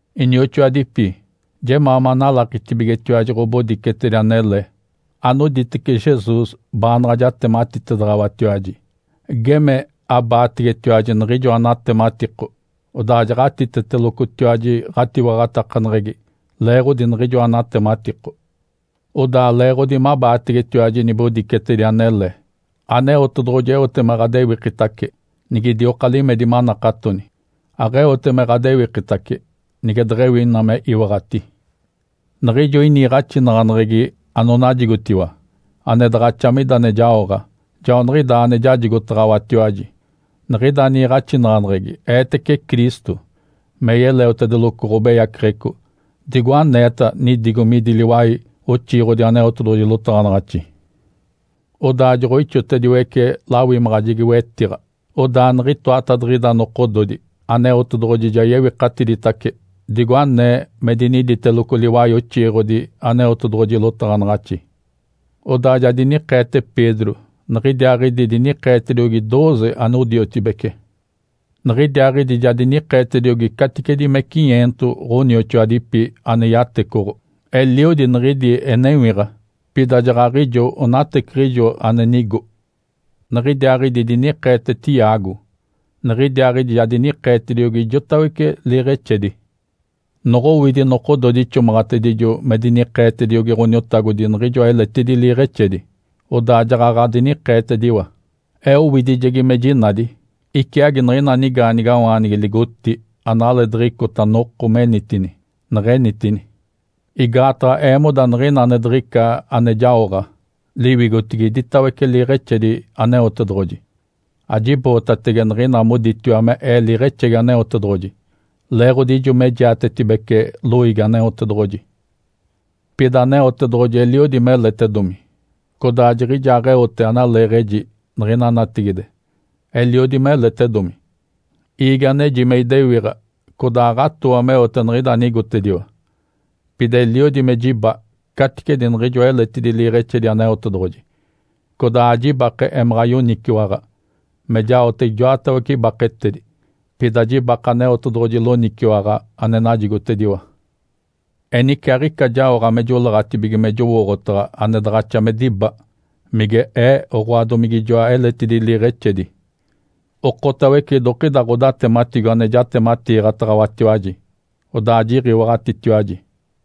Inioxoadipi, jemaa manalakitibigetiwaji ɡ̶obodicetedi anele anoditece Jesus baanaɡ̶a jatematitedaɡ̶awatiwaji. Geme abaategetiwaji niɡ̶ijoa natematiko, odaa jaɡ̶atitetelocotiwaji ɡ̶atiwaɡ̶atakaneɡ̶egi leeɡ̶odi niɡ̶ijoa natematiko. Odaa leeɡ̶odi mabaategetiwaji nibodicetedi anele, Aneotedoɡ̶oji eote me ɡ̶adewikitace, nigidioka limedi manakatoni. Aɡ̶eote me ɡ̶adewikitace nige deɡ̶ewi ina me iwaɡ̶ati. Niɡ̶ijo iniiɡ̶axinaɡ̶aneɡ̶egi anonajigotiwa, ane daɡ̶axa mida ane jaoɡ̶a, joaniɡ̶idaa ane jajigotaɡ̶awatiwaji. Niɡ̶ida niiɡ̶axinaɡ̶aneɡ̶egi eetece Cristo me yeleotedeloco ɡ̶obeyaceɡ̶eco, digo aneeta nidigo midi liwai oxiiɡ̶odi Aneotedoɡ̶oji lotaɡ̶anaɡ̶axi. Odaa joɡ̶oixotediwece lawimaɡ̶ajegi-wetiɡ̶a, odaa niɡ̶itoatadiɡ̶ida nokododi Aneotedoɡ̶oji ja yewikatiditace digo anee me diniditeloco liwai oxiiɡ̶odi Aneotedoɡ̶oji lotaɡ̶anaɡ̶axi. Odaa ja dinikeete Pedro niɡ̶idiaaɡ̶idi dinikeetediogi dooze anodiotibece. Niɡ̶idiaaɡ̶idi ja dinikeetediogi caticedi me cinyeento ɡ̶onioxoadipi ane yatecoɡ̶o. Eliodi niɡ̶idi enewiɡ̶a, pida jaɡ̶aɡ̶ijo onateciɡ̶ijo ane nigo. Niɡ̶idiaaɡ̶idi dinikeete Tiago, niɡ̶idiaaɡ̶idi ja dinikeetacediogi ijoatawece liiɡ̶exedi. Noɡ̶owidi nokododi ixomaɡ̶atedijo me dinikeetediogi Ǥoniotagodi niɡ̶ijoa eletidi liiɡ̶exedi, odaa jaɡ̶aɡ̶a dinikeetediwa, ee owidijegi me jinadi, iciagi niɡ̶ina nigaanigawaanigi ligotí analeediɡ̶icota noko menitini, neɡ̶enitini. Igaataɡ̶a eemoda niɡ̶ina ane diɡ̶ica ane jaoɡ̶a liwigotigi idiwatawece liiɡ̶exedi Aneotedoɡ̶oji. Ajibootatege niɡ̶ina moditiwa me ee “liiɡ̶exegi Aneotedoɡ̶oji”, leeɡ̶odi ijo me jiatetibece loiigi Aneotedoɡ̶oji. Pida Aneotedoɡ̶oji eliodi meletedomi codaa jiɡ̶ijaaɡ̶eote analeeɡ̶eji niɡ̶ina natigide. Eliodi meletedomi, iigi aneji me idewiɡ̶a codaa aɡ̶atooa meote niɡ̶ida anigotediwa. Pida eliodi me jiba caticedi niɡ̶ijoa eletidi liiɡ̶exedi Aneotedoɡ̶oji. Codaa ajibake emaɡ̶a yoniciwaɡ̶a me jaote ijoatawece ibaketedi, pida jibake Aneotedoɡ̶oji loniciwaɡ̶a ane najigotediwa. Enice aɡ̶ica jaoɡ̶a me joleeɡ̶atibige me jowooɡ̶otaɡ̶a ane daɡ̶axa me diba, mige ee oɡ̶oa domige ijoa eletidi liiɡ̶exedi. Okotawece idokida ɡ̶odatematigo ane jatematiiɡ̶ataɡ̶awatiwaji, odaa jiɡ̶iwaɡ̶atitiwaji.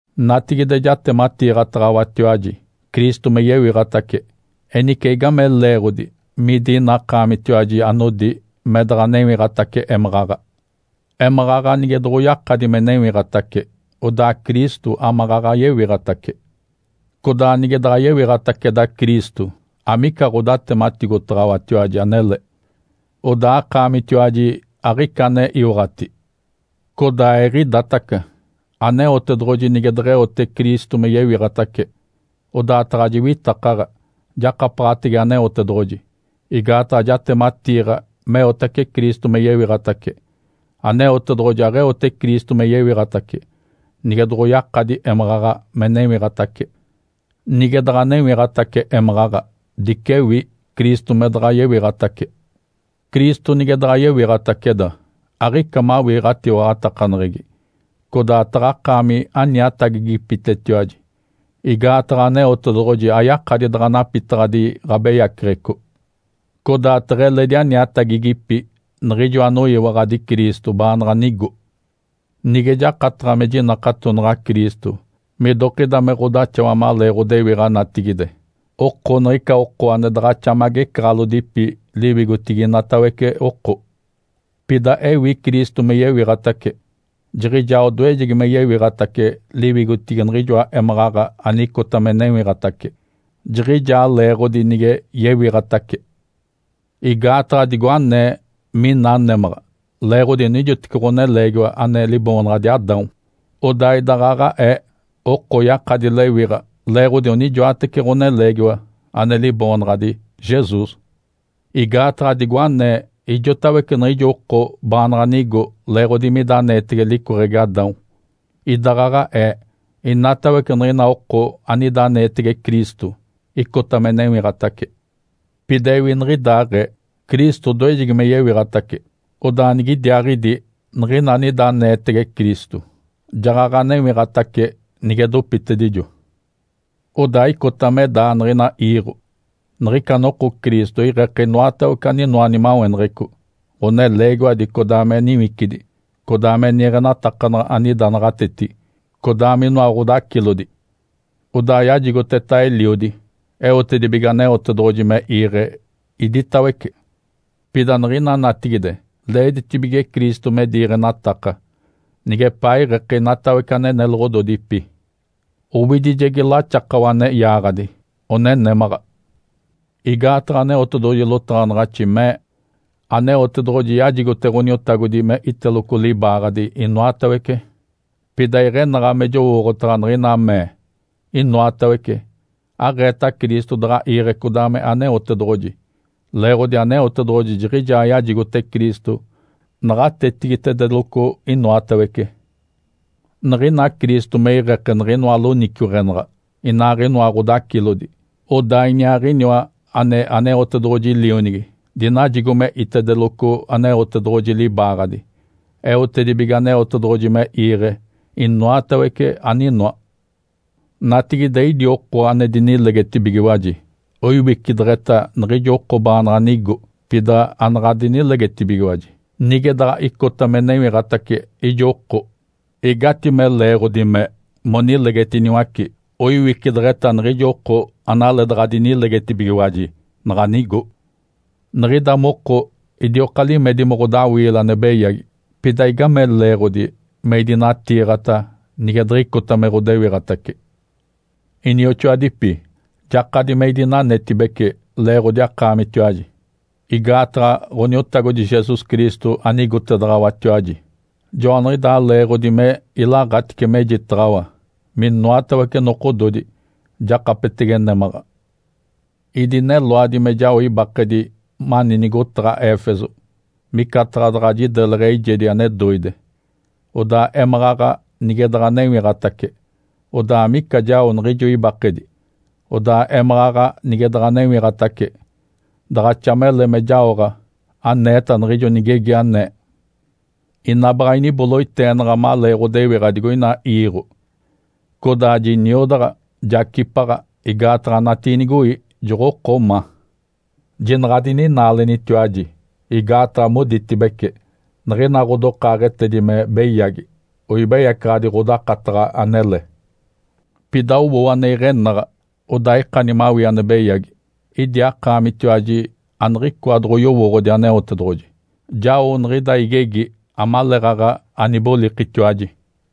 Natigide jatematiiɡ̶ataɡ̶awatiwaji Cristo me yewiɡ̶atace. Enice igame leeɡ̶odi midi ina akaamitiwaji anodi me daɡ̶a newiɡ̶atace émaɡ̶aɡ̶a? Émaɡ̶aɡ̶a nige doɡ̶oyakadi me newiɡ̶atace, odaa Cristo amaɡ̶aɡ̶a yewiɡ̶atace. Codaa nige daɡ̶a yewiɡ̶ataceda Cristo, amica ɡ̶odatematigotaɡ̶awatiwaji anele, odaa akaamitiwaji aɡ̶ica ane iwaɡ̶ati. Codaa eɡ̶idaataca, Aneotedoɡ̶oji nige deɡ̶eote Cristo me yewiɡ̶atace, odaa taɡ̶a jiwitakaɡ̶a jakapaɡ̶atege Aneotedoɡ̶oji igaataɡ̶a jatematiiɡ̶a meotace Cristo me yewiɡ̶atace. Aneotedoɡ̶oji aɡ̶eote Cristo me yewiɡ̶atace, nige doɡ̶oyakadi émaɡ̶aɡ̶a me newiɡ̶atace. Nige daɡ̶a newiɡ̶atace émaɡ̶aɡ̶a, dicewi Cristo me daɡ̶a yewiɡ̶atace. Cristo nige daɡ̶a yewiɡ̶ataceda, aɡ̶ica mawii ɡ̶atiwaɡ̶atakaneɡ̶egi, codaa taɡ̶akaami aniatagigipitetiwaji igaataɡ̶a Aneotedoɡ̶oji ayakadi daɡ̶a napitaɡ̶adi ɡ̶abeyaceɡ̶eco. Codaa teɡ̶eledi aniatagigipi niɡ̶ijo anoyiwaɡ̶adi Cristo, baanaɡ̶a nigo. Nige jakataɡ̶a mejiwaɡ̶ataɡ̶a Cristo midokida me ɡ̶odaxawa malee ɡ̶odewiɡ̶a natigide, oko niɡ̶ica oko ane daɡ̶axa me agecaɡ̶alodipi liwigotigi inatawece oko. Pida ewi Cristo me yewiɡ̶atace, Jiɡ̶ijaa odoejegi me yewiɡ̶atace liwigotigi niɡ̶ijoa émaɡ̶aɡ̶a anicota me newiɡ̶atace, jiɡ̶ijaa leeɡ̶odi nige yewiɡ̶atace. Igaataɡ̶a digo anee mina némaɡ̶a leeɡ̶odi onijoteci ɡ̶oneleegiwa ane liboonaɡ̶adi Adão, odaa idaɡ̶aɡ̶aee oko oyakadi lewiɡ̶a leeɡ̶odi onijoatece ɡ̶oneleegiwa ane liboonaɡ̶adi Jesus. Igaataɡ̶a digo anee ijotawece niɡ̶ijo oko baanaɡ̶a nigo leeɡ̶odi mida aneetege licoɡ̶egi Adão, idaɡ̶aɡ̶aee inatawece niɡ̶ina oko anida aneetege Cristo icota me newiɡ̶atace. Pida ewi niɡ̶idaaɡ̶ee. Cristo odoejegi me yewiɡ̶atace. Odaa nigidiaaɡ̶idi niɡ̶ina anida aneetege Cristo jaɡ̶aɡ̶a newiɡ̶atace nige dopitedijo. Odaa icota me daa niɡ̶ina iiɡ̶o. Niɡ̶ica noko Cristo iɡ̶eke inoatawece aninoa nimaweneɡ̶eco, ɡ̶oneleegiwadi codaa me niwicidi, codaa ane niiɡ̶enatakanaɡ̶a anida naɡ̶atetigi, codaa minoa ɡ̶odacilodi. Odaa yajigoteta Eliodi, eotedibige Aneotedoɡ̶oji me iiɡ̶e iditawece. Pida niɡ̶ina natigide leeditibige Cristo me diiɡ̶enataka nigepaa iɡ̶eke inatawece ane neloɡ̶ododipi. Owidijegi laxakawa ane yaaɡ̶adi, one némaɡ̶a. Igaataɡ̶a Aneotedoɡ̶oji lotaɡ̶anaɡ̶axi mee, “Aneotedoɡ̶oji yajigote Ǥoniotagodi me iteloco libaaɡ̶adi inoatawece.” Pida iɡ̶enaɡ̶a me jowooɡ̶otaɡ̶a niɡ̶ina mee, “inoatawece”, aɡ̶eeta Cristo daɡ̶a iiɡ̶e codaa me Aneotedoɡ̶oji, leeɡ̶odi Aneotedoɡ̶oji jiɡ̶ijaa yajigote Cristo naɡ̶atetigitedeloco inoatawece. Niɡ̶ina Cristo me iɡ̶eke niɡ̶inoa loniciweɡ̶enaɡ̶a, inaaɡ̶inoa ɡ̶odacilodi, odaa Iniaaɡ̶iniwa, ane Aneotedoɡ̶oji Lionigi, dinajigo me itedeloco Aneotedoɡ̶oji libaaɡ̶adi, eotedibige Aneotedoɡ̶oji me iiɡ̶e inoatawece aninoa. Natigide, idi oko ane dinilegetibigiwaji oiwicideɡ̶eta niɡ̶ijo oko baanaɡ̶a nigo pida anaɡ̶a dinilegetibigiwaji. Nige daɡ̶a icota me newiɡ̶atace ijo oko, igatime leeɡ̶odi me monilegetiniwace oiwicideɡ̶eta niɡ̶ijo oko analeedaɡ̶a dinilegetibigiwaji naɡ̶a nigo? Niɡ̶ida moko, idioka limedi me ɡ̶odawiile ane beyagi. Pida igame leeɡ̶odi me idinatiiɡ̶ata nige diɡ̶icota me ɡ̶odewiɡ̶atace? Inioxoadipi, jakadi me idinanetibece leeɡ̶odi akaamitiwaji igaataɡ̶a Ǥoniotagodi Jesus Cristo anigotedaɡ̶awatiwaji, joaniɡ̶idaa leeɡ̶odi me ilaɡ̶atice mejitaɡ̶awa minoatawece nokododi jakapetege némaɡ̶a. Idineloadi me jao ibakedi mani nigotaɡ̶a Éfeso micataɡ̶a daɡ̶a jideleɡ̶e eijedi ane doide. Odaa émaɡ̶aɡ̶a nige daɡ̶a newiɡ̶atace, odaa amica jao niɡ̶ijo ibakedi. Odaa émaɡ̶aɡ̶a nige daɡ̶a newiɡ̶atace, daɡ̶axa mele me jaoɡ̶a aneeta niɡ̶ijo nigegi anee, “Ina baɡ̶a iniboloiteenaɡ̶a malee ɡ̶odewiɡ̶a digoina iiɡ̶o, codaa jiniodaɡ̶a, jacipaɡ̶a igaataɡ̶a natiinigoi joɡ̶oko ma.” Jinaɡ̶a adininaalenitiwaji! Igaataɡ̶a moditibece, “Niɡ̶ina ɡ̶odokaaɡ̶etedi me beyagi oibeyacaɡ̶adi ɡ̶odakataɡ̶a anele.” Pida owoo ane iɡ̶enaɡ̶a, odaa ikani mawii ane beyagi. Idi akaamitiwaji aniɡ̶icoa doɡ̶oyowooɡ̶odi Aneotedoɡ̶oji. Jao niɡ̶ida igegi amaleeɡ̶aɡ̶a anibolikitiwaji.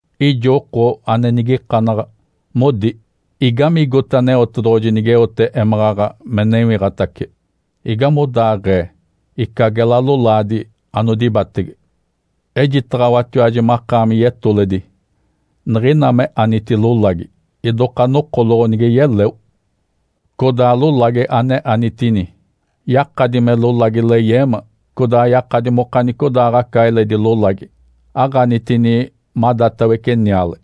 Ijo oko ane nigikanaɡ̶a, modi, “Igamigigote Aneotedoɡ̶oji nigeote émaɡ̶aɡ̶a me newiɡ̶atace? Igamigodaaɡ̶ee ica gela lolaadi anodibatege?” Ejitaɡ̶awatiwaji makaami yetoledi! Niɡ̶ina me aniti lolagi, idoka nokoloɡ̶o nige yeleo. Codaa lolagi ane anitini, yakadi me lolagi leyeema, codaa yakadi mokanicodaaɡ̶aca eledi lolagi. Aɡ̶anitini madatawece niale.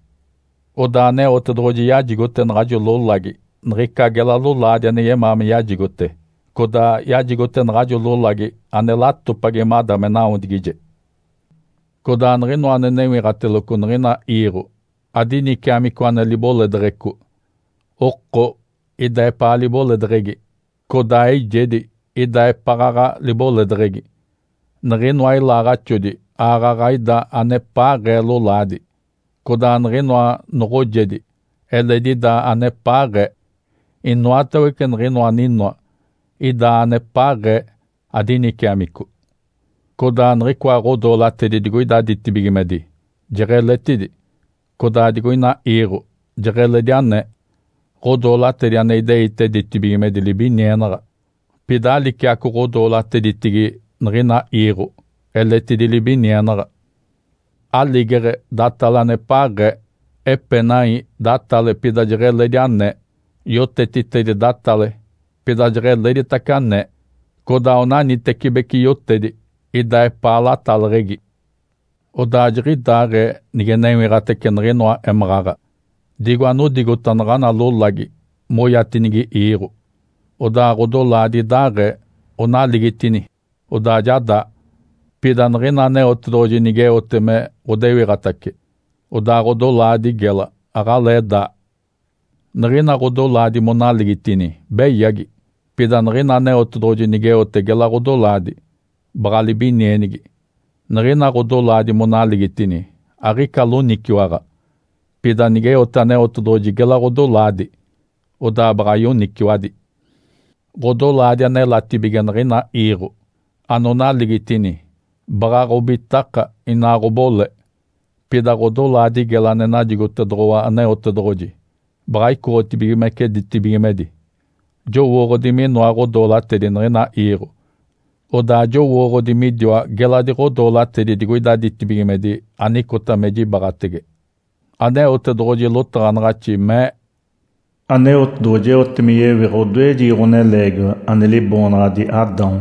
Odaa Aneotedoɡ̶oji yajigote naɡ̶ajo lolagi niɡ̶ica gela lolaadi ane yemaa me yajigote, codaa yajigote naɡ̶ajo lolagi ane latopagi mada me nawodigije. Codaa niɡ̶inoa ane newiɡ̶ateloco niɡ̶ina iiɡ̶o adiniciamico ane liboledeɡ̶eco. Oko ida epaa liboledeɡ̶egi, codaa eijedi ida epaɡ̶aɡ̶a liboledeɡ̶egi. Niɡ̶inoa ilaaɡ̶axodi aaɡ̶aɡ̶a ida anepaaɡ̶ee lolaadi, codaa niɡ̶inoa noɡ̶ojedi eledi ida anepaaɡ̶ee. Inoatawece niɡ̶inoa aninoa ida anepaaɡ̶ee adiniciamico. Codaa niɡ̶icoa ɡ̶odoolatedi digoida ditibigimedi jeɡ̶eletidi, codaa digoina iiɡ̶o jeɡ̶eledi anee. Ǥodoolatedi ane ideite ditibigimedi libinienaɡ̶a, pida aliciaco ɡ̶odoolateditigi niɡ̶ina iiɡ̶o eletidi libinienaɡ̶a. Aligeɡ̶e datale anepaaɡ̶ee, epenai datale pida jeɡ̶eledi anee, yotetitedi datale pida jeɡ̶eletiditace anee. Codaa onanitecibeci yotedi ida epaa lataleɡ̶egi. Odaa jiɡ̶idaaɡ̶ee nige newiɡ̶atace niɡ̶inoa émaɡ̶aɡ̶a. Digo anodigota naɡ̶ana lolagi moyatinigi iiɡ̶o, odaa ɡ̶odolaadi idaaɡ̶ee, onaligitini, odaa ja daa. Pida niɡ̶ina Aneotedoɡ̶oji nigeote me ɡ̶odewiɡ̶atace, odaa ɡ̶odolaadi gela aɡ̶alee daa. Niɡ̶ina ɡ̶odolaadi monaligitini, beyagi. Pida niɡ̶ina Aneotedoɡ̶oji nigeote gela ɡ̶odolaadi, baɡ̶a libinienigi. Niɡ̶ina ɡ̶odolaadi monaligitini, aɡ̶ica loniciwaɡ̶a. Pida nigeote Aneotedoɡ̶oji gela ɡ̶odolaadi, odaa baɡ̶a yoniciwadi. Ǥodolaadi anelatibige niɡ̶ina iiɡ̶o, anonaligitini, baɡ̶a ɡ̶obitaka, inaa ɡ̶obole. Pida ɡ̶odolaadi gela ane najigotedoɡ̶owa Aneotedoɡ̶oji baɡ̶a icoɡ̶otibigimece ditibigimedi. Jowooɡ̶odi minoa ɡ̶odoolatedi niɡ̶ina iiɡ̶o, odaa jowooɡ̶odi midiwa geladi ɡ̶odoolatedi digoida ditibigimedi anicota me jibaɡ̶atege. Aneotedoɡ̶oji lotaɡ̶anaɡ̶axi mee, “Aneotedoɡ̶oji eote me yewiɡ̶a odoejegi ɡ̶oneleegiwa, ane liboonaɡ̶adi Adão.”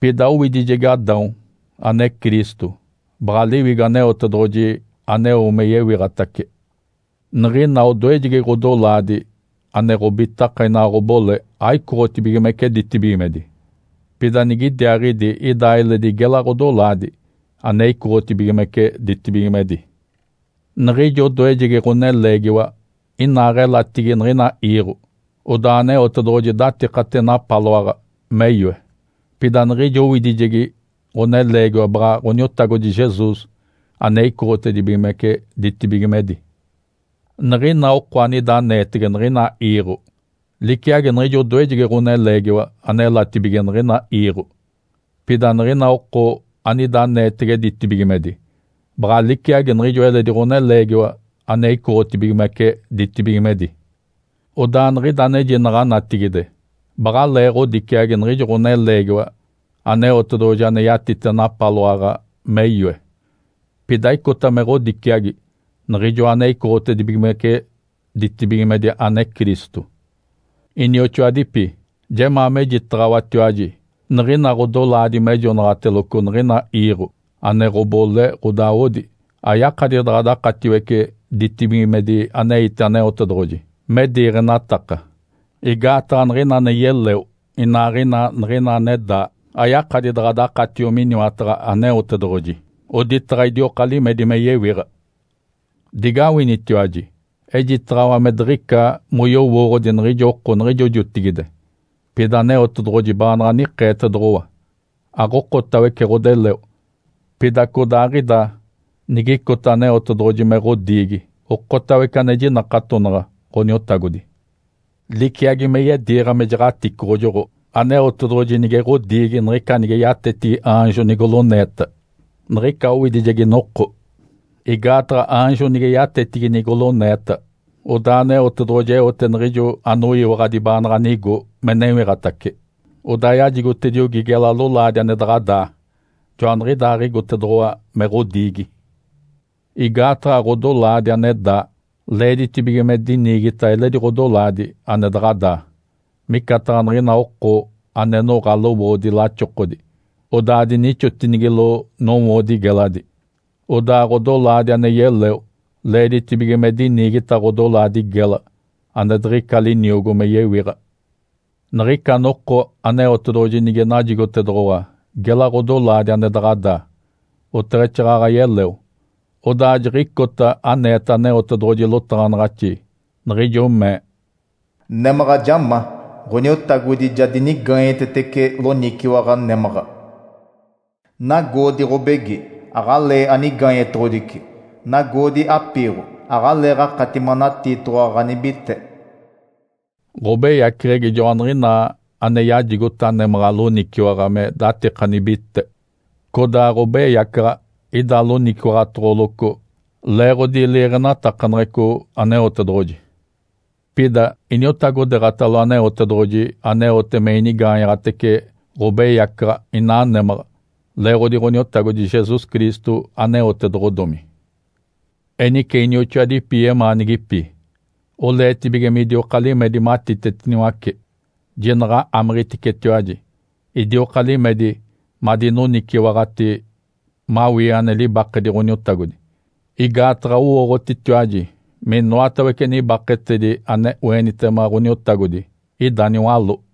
Pida owidijegi Adão (ane Cristo) baɡ̶a Liwigo Aneotedoɡ̶oji aneo me yewiɡ̶atace. Niɡ̶ina odoejegi ɡ̶odolaadi ane ɡ̶obitaka, inaa ɡ̶obole aicoɡ̶otibigimece ditibigimedi. Pida nigidiaaɡ̶idi ida eledi gela ɡ̶odolaadi ane icoɡ̶otibigimece ditibigimedi. Niɡ̶ijo odoejegi ɡ̶oneleegiwa inaaɡ̶elatigi niɡ̶ina iiɡ̶o, odaa Aneotedoɡ̶oji datikate napaloaɡ̶a me yoe. Pida niɡ̶ijo owidijegi ɡ̶oneleegiwa baɡ̶a Ǥoniotagodi Jesus ane icoɡ̶otedibigimece ditibigimedi. Niɡ̶ina oko anida aneetege niɡ̶ina iiɡ̶o liciagi niɡ̶ijo odoejegi ɡ̶oneleegiwa anelatibige niɡ̶ina iiɡ̶o. Pida niɡ̶ina oko anida aneetege ditibigimedi baɡ̶a liciagi niɡ̶ijo eledi ɡ̶oneleegiwa ane icoɡ̶otibigimece ditibigimedi. Odaa niɡ̶ida anejinaɡ̶a natigide baɡ̶alee ɡ̶odiciagi niɡ̶ijo ɡ̶oneleegiwa Aneotedoɡ̶oji ane yatite napaloaɡ̶a me yoe, pida icota me ɡ̶odiciagi Niɡ̶ijoa ane icoɡ̶otibigimece ditibigimedi ane Cristo. Inioxoadipi, jemaa mejitaɡ̶awatiwaji niɡ̶ina ɡ̶odolaadi maleeɡ̶ejonaɡ̶ateloco niɡ̶ina iiɡ̶o, ane ɡ̶obole, ɡ̶odawodi ayakadi daɡ̶a dakatiwece ditibigimedi aneite Aneotedoɡ̶oji me diiɡ̶enataka. Igaataɡ̶a niɡ̶ina ane yeleo inaaɡ̶ina niɡ̶ina ane daa, ayakadi daɡ̶a dakatio miniwataɡ̶a Aneotedoɡ̶oji, oditaɡ̶a idioka limedi me yewiɡ̶a. Digawinitiwaji! Ejitaɡ̶awa me diɡ̶ica moyowooɡ̶odi niɡ̶ijo oko niɡ̶ijo jotigide, pida Aneotedoɡ̶oji baanaɡ̶a nikeetedoɡ̶owa. Aɡ̶okotawece ɡ̶odeleo, pida codaaɡ̶ida nigicota Aneotedoɡ̶oji me ɡ̶odiigi okotawece ane jinakatonaɡ̶a Ǥoniotagodi. Liciagi me yediiɡ̶a me jaɡ̶aticoɡ̶ojoɡ̶o, Aneotedoɡ̶oji nige ɡ̶odiigi niɡ̶ica nige yatetigi aanjo nigoloneeta niɡ̶ica owidijegi noko. Igaataɡ̶a aanjo nige yatetigi nigoloneeta, odaa Aneotedoɡ̶oji eote niɡ̶ijo anoyiwaɡ̶adi baanaɡ̶a nigo me newiɡ̶atace, odaa yajigotediogi gela lolaadi ane daɡ̶a daa. Joaniɡ̶idaaɡ̶igotedoɡ̶owa me ɡ̶odiigi. Igaataɡ̶a ɡ̶odolaadi ane daa leeditibige me diniigita eledi ɡ̶odolaadi ane daɡ̶a daa, micataɡ̶a niɡ̶ina oko ane noɡ̶a lowoodi laxokodi, odaa dinixotinigilo nowoodi geladi. Odaa ɡ̶odolaadi ane yeleo leeditibige me diniigita ɡ̶odolaadi gela ane diɡ̶ica liniogo me yewiɡ̶a. Niɡ̶ica noko Aneotedoɡ̶oji nige najigotedoɡ̶owa gela ɡ̶odolaadi ane daɡ̶a daa, oteɡ̶exaaɡ̶aɡ̶a yeleo, odaa jiɡ̶icota aneeta Aneotedoɡ̶oji lotaɡ̶anaɡ̶axi niɡ̶ijo mee, “Némaɡ̶a ja ma. Ǥoniotagodi ja dinigaanyetetece loniciwaɡ̶a némaɡ̶a. Nagoodi ɡ̶obegi! Aɡ̶alee anigaanyetoɡ̶odici. Nagoodi apiiɡ̶o! Aɡ̶aleeɡ̶akati manatiitoɡ̶owa ɡ̶anibite.” Ǥobeyaceɡ̶egi joaniɡ̶inaa ane yajigota némaɡ̶a loniciwaɡ̶a me datika nibite, codaa ɡ̶obeyacaɡ̶a ida loniciwaɡ̶atoɡ̶oloco leeɡ̶odi liiɡ̶enatakaneɡ̶eco Aneotedoɡ̶oji. Pida iniotagodeeɡ̶atalo Aneotedoɡ̶oji, aneote me inigaanyaɡ̶atece ɡ̶obeyacaɡ̶a inaa némaɡ̶a leeɡ̶odi Ǥoniotagodi Jesus Cristo aneotedoɡ̶odomi. Enice, inioxoadipi yemaanigipi, oleetibige midioka limedi matitetiniwace, jinaɡ̶a amiɡ̶iticetiwaji! Idioka limedi madinoniciwaɡ̶ati mawii ane libakedi Ǥoniotagodi. Igaataɡ̶a owooɡ̶otitiwaji minoatawece nibaketedi ane oenitema Ǥoniotagodi ida niwaló.